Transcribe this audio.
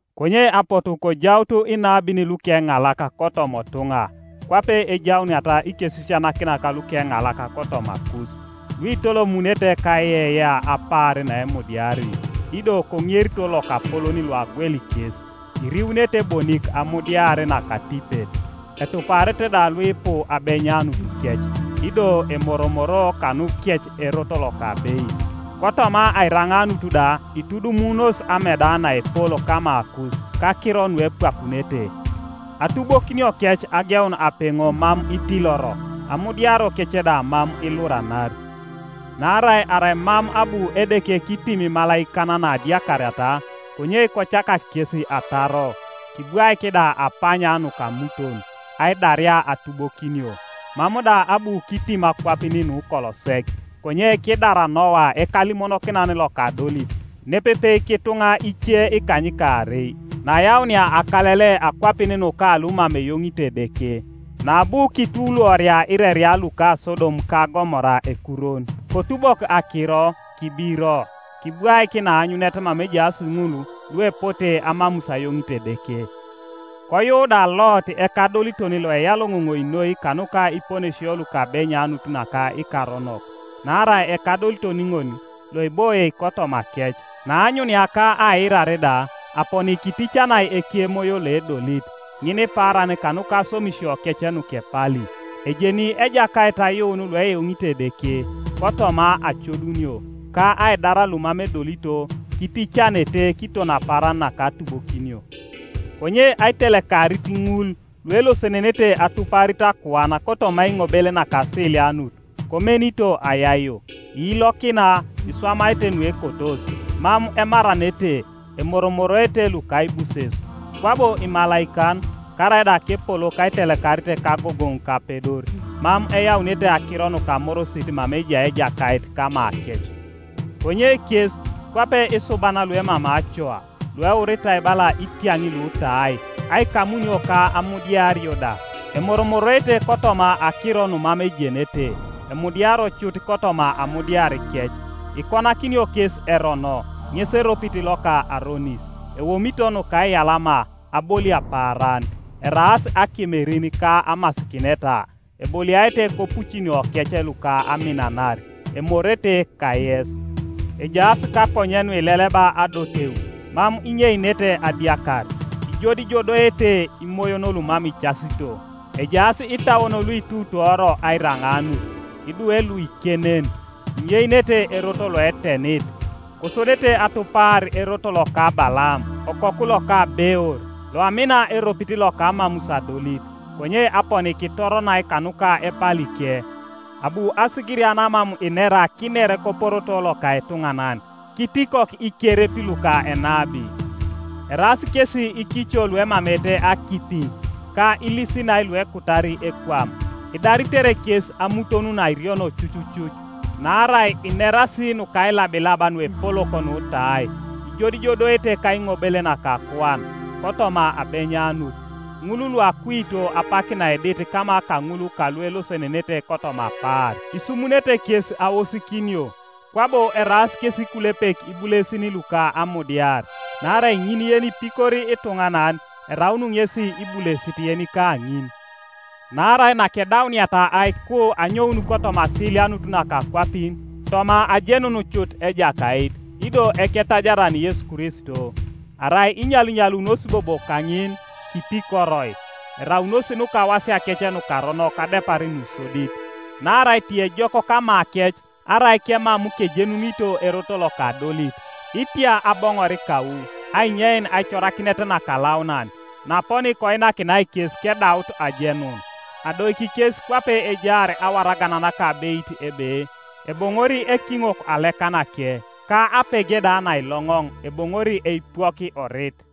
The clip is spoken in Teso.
Konye apotu kojaut inabin lukeŋalak kotoma otuŋa, kwape ejauniata ikesisianakinak lukeŋalak kotomakus, luitolomunete kaiyeiyea apaar naemudiari, ido koŋerito Lokapolon loagweli kes, iriunete bonik amudiar nakatipet. Etuparete da luipu abenyanutukec, ido emoromoroo kanukec erot loka abeit. Kotoma airaŋaanut da itudumunos ameda naepol kamakus kakiro nuepwakunete; atubokiniokec ageun apeŋo mam itiloro, amudiariokec da mam iluranari. Naarai arai mam abu Edeke kitim imalaikan naadiakariata, konye kocakak kes ataro, kibwaik da apanya nukamuton, aidaria atubokinio, mam da abu kitim akwapin nukolo sek, konye kidar Noa ekalimonokinan loka adolit nepepe kituŋa ice ikanykaarei, naayaunia akalele akwapin nuka lumam eyoŋito Edeke; naabu kituluoria ireria luka Sodom ka Gomora ekurwon, kotubok akiro kibiro, kibwaik naanyunet mama ejaas ŋul luepote amamus ayoŋit Edeke; koyuu da Lot ekadoliton loeyaloŋoŋoi noi kanuka iponesio luka abenyanut naka ikaronok, (naarai ekadoliton ŋol loeboie kotomakec, naaanyunia ka aiirar da, aponi kiticanai ekemoyo loedolit, ŋinipaaran kanuka aswamisiokec nukepali), ejeni Ejakait ayuun lueyoŋito Edeke kotoma acodunio, ka aidar lumam edolito kiticanete kiton apaaran naka atubokinio; konye aitelekarit ŋul luelosenenete atuparit akuan kotoma aiŋobel nakasilianut, komenito ayaio. Iilokina, iswamaete nuekotos, mam emaranete emoromoroete lukaibuses, kwabo imalaikan, karaida kepolok aitelekarit kagogoŋ ka apedor, mam eyaunete akiro nuka amorosit mama ejai Ejakait kamakec. Konye kes, kwape isuban luemamei acoa, lueuritai bala itiaŋ lutai aikamunio ka amudiario da, emoromoroete kotoma akiro numam ejenete, emudiario cut kotoma amudiarikec, ikonakinio kes erono ŋes eropit loka aronis. Eomito nukaiyalama abolia paaran. Eraas akemerin ka amasikineta, eboliaete kopucinokec luka aminanar, emorete kayes. Ejaas kakonye nuileleba adoteu, mam inyeinete adiakar. Ijodijodoete imoyon lumam icasito. Ejaas itauon luituutoro airaŋaanut. Idwe luikenen! Inyeinete erot loetenit, kosodete apaar atupar erot loka Balaam, okoku loka Beor, loamina eropit loka amamus adolit, konye aponi kitoronai kanuka epalike; abu asigiria namam inera kiner koporoto loka etuŋanan, kitikok ikerep luka enabi. Eraas kesi ikico luemameete akipi, ka ilisinai luekutari ekwam; idaritere kes amuton nairiono cucucuc. Naarai inerasi nukailabilab nuepolok nutai, ijodijodoete kaiŋobel naka akuan kotoma abenyanut, ŋul luakuito apak naedit kama kaŋul kaluelosenenete kotoma apaar. Isumunete kes aosikinio, kwabo eraas kesi ikulepek ibulesin luka amudiar; naarai ŋin yenipikori ituŋanan, eraun ŋesi ibulesit yenika ŋin. Naarai nakedauniata aiku anyoun kotoma asilianut naka akwapin, toma ajenun cut Ejakait, ido Eketajaran Yesu Kristo, arai inyalinyalunos bobo kaŋin, kipikoroi, eraunos nukawasiakec nukaronok adepar nusodit. Naarai tiejok kamakec arai kemam kejenunito erot loka adolit, itia aboŋor kau ainyein aicorakinet nakalaunan naaponi koinakinai kes kedaut ajenun. Adoiki kes kwape ejaar awaragan nakabeit ebe, Eboŋori ekiŋok alekanake, ka apege da nailoŋoŋ eboŋori eipwok orit.